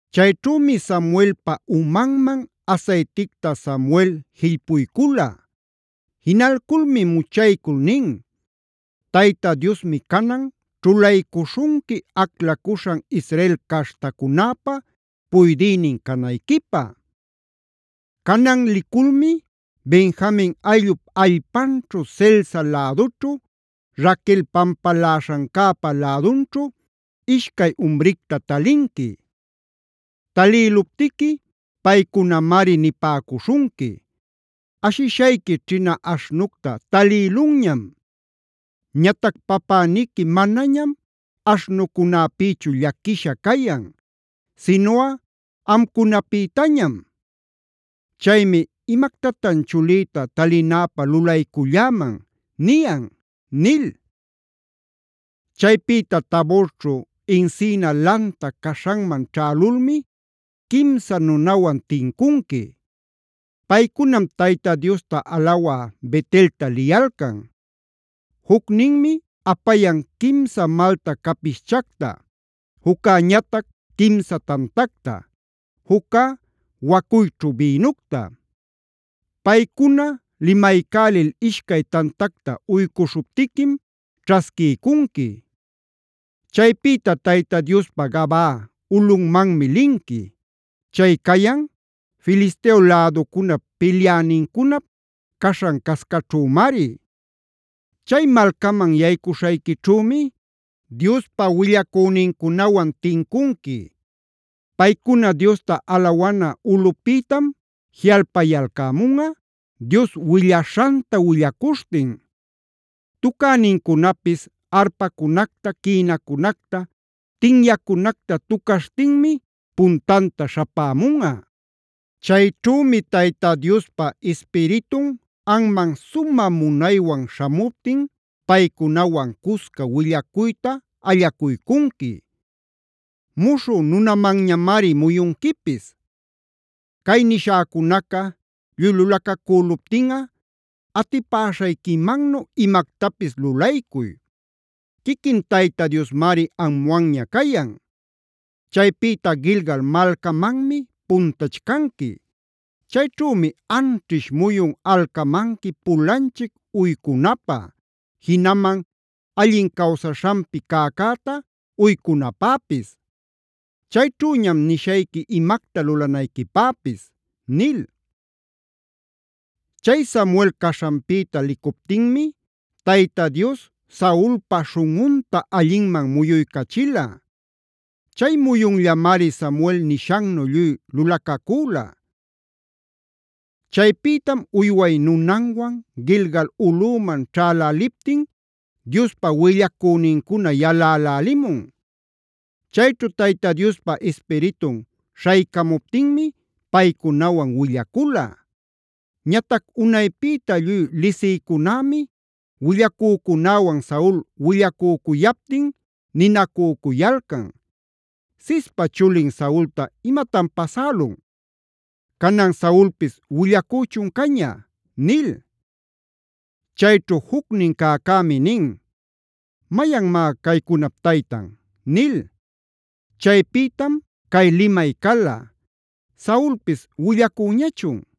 Chayćhümi Saulpa umanman asayticta Samuel jillpuycula. Jinalculmi muchaycul nin: “Tayta Diosmi canan ćhulaycuśhunqui aclacuśhan Israel caśhtacunäpa puydïnin canayquipä. Canan liculmi Benjamin ayllup allpanćhu Selsa lädućhu, Raquel pampaläśhancäpa lädunćhu ishcay umricta talinqui. Talïluptiqui paycunamari nipäcuśhunqui: ‘Ashishayqui ćhina aśhnucta talïlunñam. Ñatac papäniqui manañam aśhnucunäpïchu llaquisha cayan, sinuꞌa amcunapïtañam. Chaymi: “¿Imactatan chulïta talinäpä lulayculläman?” niyan’ nil. Chaypïta Taborćhu encina lanta caśhanman ćhälulmi quimsa nunawan tincunqui. Paycunam Tayta Diosta alawa Bet-elta liyalcan. Jucninmi apayan quimsa malta capischacta, juccäñatac quimsa tantacta, juccá wacuyćhu bïnucta. Paycuna limaycälil ishcay tantacta uycuśhuptiquim ćhasquiycunqui. Chaypïta Tayta Diospa Gabaa ulꞌunmanmi linqui. Chay cayan Filisteo läducunap pilyänincunap caśhan-cascaćhümari. Chay malcaman yaycuśhayquićhümi Diospa willacünincunawan tincunqui. Paycuna Diosta alawana ulꞌupïtam jiꞌalpayalcämunꞌa Dios willaśhanta willacuśhtin; tucänincunapis arpacunacta, quïnacunacta, tinyacunacta tucaśhtinmi puntanta śhapämunꞌa. Chayćhümi Tayta Diospa Ispiritun anman sumä munaywan śhamuptin paycunawan cusca willacuyta allacuycunqui; muśhü nunamanñamari muyunquipis. Cay nishäcunaca lluy lulacacüluptinꞌa atipäśhayquimannu imactapis lulaycuy; quiquin Tayta Diosmari amwanña cayan. Chaypïta Gilgal malcamanmi puntachcanqui. Chayćhümi anćhish muyun alcamanqui pulanchic uycunapä, jinaman allin cawsaśhanpi cäcäta uycunapäpis. Chayćhüñam nishayqui imacta lulanayquipäpis” nil. Chay Samuel caśhanpïta licuptinmi Tayta Dios Saulpa śhunꞌunta allinman muyuycachila. Chay muyunllamari Samuel nishannu lluy lulacacüla. Chaypïtam uyway nunanwan Gilgal ulꞌüman ćhäläliptin Diospa willacünincuna yalälälimun. Chayćhu Tayta Diospa Ispiritun śhaycamuptinmi paycunawan willacula. Ñatac unaypïta lluy lisïcunämi willacücunäwan Saul willacücuyaptin ninacücuyalcan: “¿Cispa chulin Saulta imatan pasälun? ¿Canan Saulpis willacüchun caña?” nil. Chayćhu jucnin cäcämi nin: “¿Mayanmá caycunap taytan?” nil. Chaypïtam cay limay cala: “¿Saulpis willacüñachun?”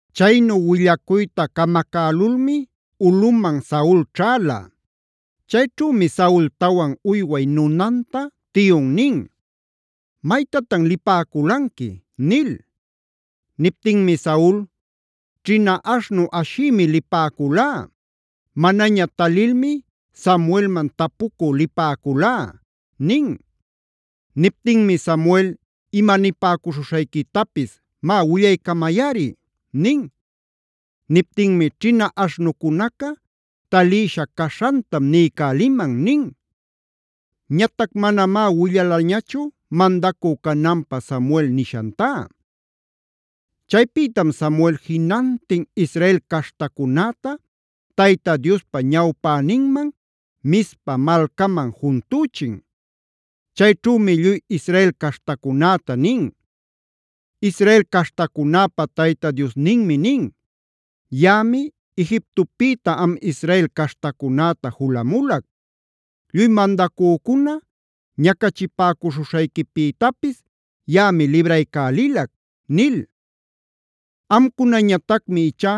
Chaynu willacuyta camacälulmi ulꞌuman Saul ćhäla. Chayćhümi Saultawan uyway nunanta tiyun nin: “¿Maytatan lipäculanqui?” nil. Niptinmi Saul: “Ćhina aśhnu ashïmi lipäculá. Manaña talilmi Samuelman tapucü lipäculá” nin. Niptinmi: “Samuel ima nipäcuśhuśhayquitapis, má willaycamayꞌari” nin. Niptinmi: “Ćhina aśhnucunaca talïsha caśhantam niycäliman” nin. Ñatac manamá willalañachu mandacü cananpä Samuel nishantá. Chaypïtam Samuel jinantin Israel caśhtacunäta Tayta Diospa ñawpäninman, Mizpa malcaman juntüchin. Chayćhümi lluy Israel caśhtacunäta nin: “Israel caśhtacunäpa Tayta Diosninmi nin: ‘Yaꞌami Egiptopïta am Israel caśhtacunäta julamulac. Lluy mandacücuna ñacachipäcuśhuśhayquipïtapis yaꞌami libraycälilac’ nil. Amcunañatacmi ichá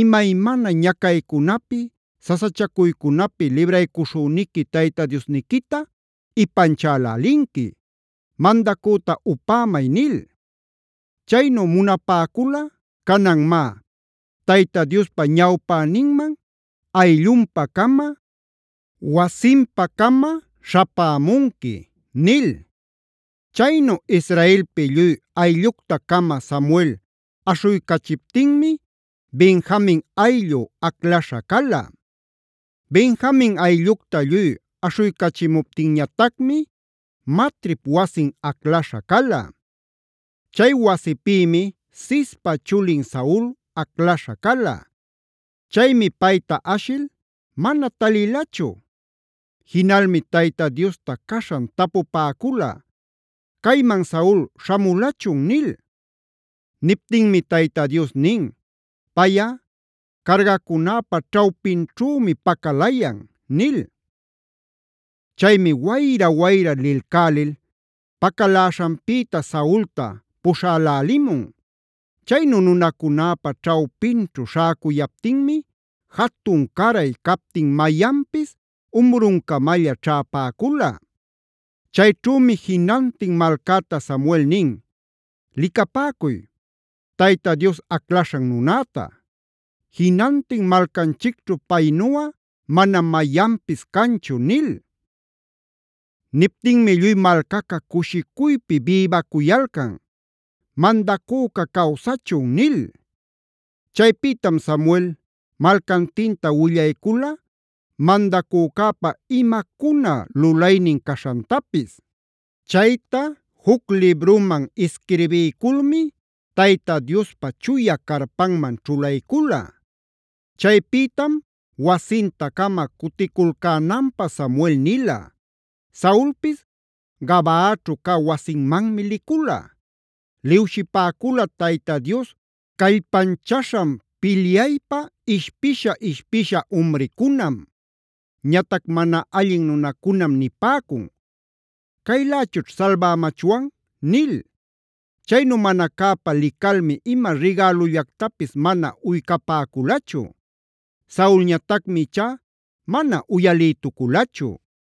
imaymana ñacaycunapi, sasachacuycunapi libraycuśhüniqui Tayta Diosniquita ipanchälälinqui: ‘Mandacüta upämay’ nil. Chaynu munapäculꞌa canan má, Tayta Diospa ñawpäninman ayllunpa-cama, wasinpa-cama śhapämunqui” nil. Chaynu israelpi lluy ayllucta-cama Samuel aśhuycachiptinmi Benjamin ayllu aclaśha cala. Benjamin ayllucta lluy aśhuycachimuptinñatacmi Matrip wasin aclaśha cala. Chay wasipïmi Cispa chulin Saul aclaśha cala. Chaymi payta ashil mana talilachu. Jinalmi Tayta Diosta caśhan tapupäcula: “¿Cayman Saul śhamulachun?” nil. Niptinmi Tayta Dios nin: “Payꞌa cargacunäpa ćhawpinćhümi pacalayan” nil. Chaymi wayra-wayra lilcälil pacaläśhanpïta Saulta puśhälälimun. Chaynu nunacunäpa ćhawpinćhu śhäcuyaptinmi jatun-caray captin mayanpis umruncamalla ćhäpäcula. Chayćhümi jinantin malcäta Samuel nin: “Licapäcuy, Tayta Dios aclaśhan nunäta. Jinantin malcanchicćhu paynuꞌa manam mayanpis canchu” nil. Niptinmi lluy malcaca cushicuypi bïbacuyalcan: “¡Mandacüca cawsachun!” nil. Chaypïtam Samuel malcantinta willaycula mandacücäpa imacuna lulaynin caśhantapis. Chayta juc libruman isquirbiyculmi Tayta Diospa chuya carpanman ćhulaycula. Chaypïtam wasinta-cama cuticulcänanpä Samuel nila. Saulpis Gabaaćhu cä wasinmanmi licula. Liwshipäcula Tayta Dios callpanchaśhan pilyaypa ishpisha-ishpisha umricunam. Ñatac mana allin nunacunam nipäcun: “¿¡Caylächućh salbämachwan!?” nil. Chaynu mana cäpa licalmi ima rigälullactapis mana uycapäculächu. Saulñatacmi ichá mana uyalïtuculachu.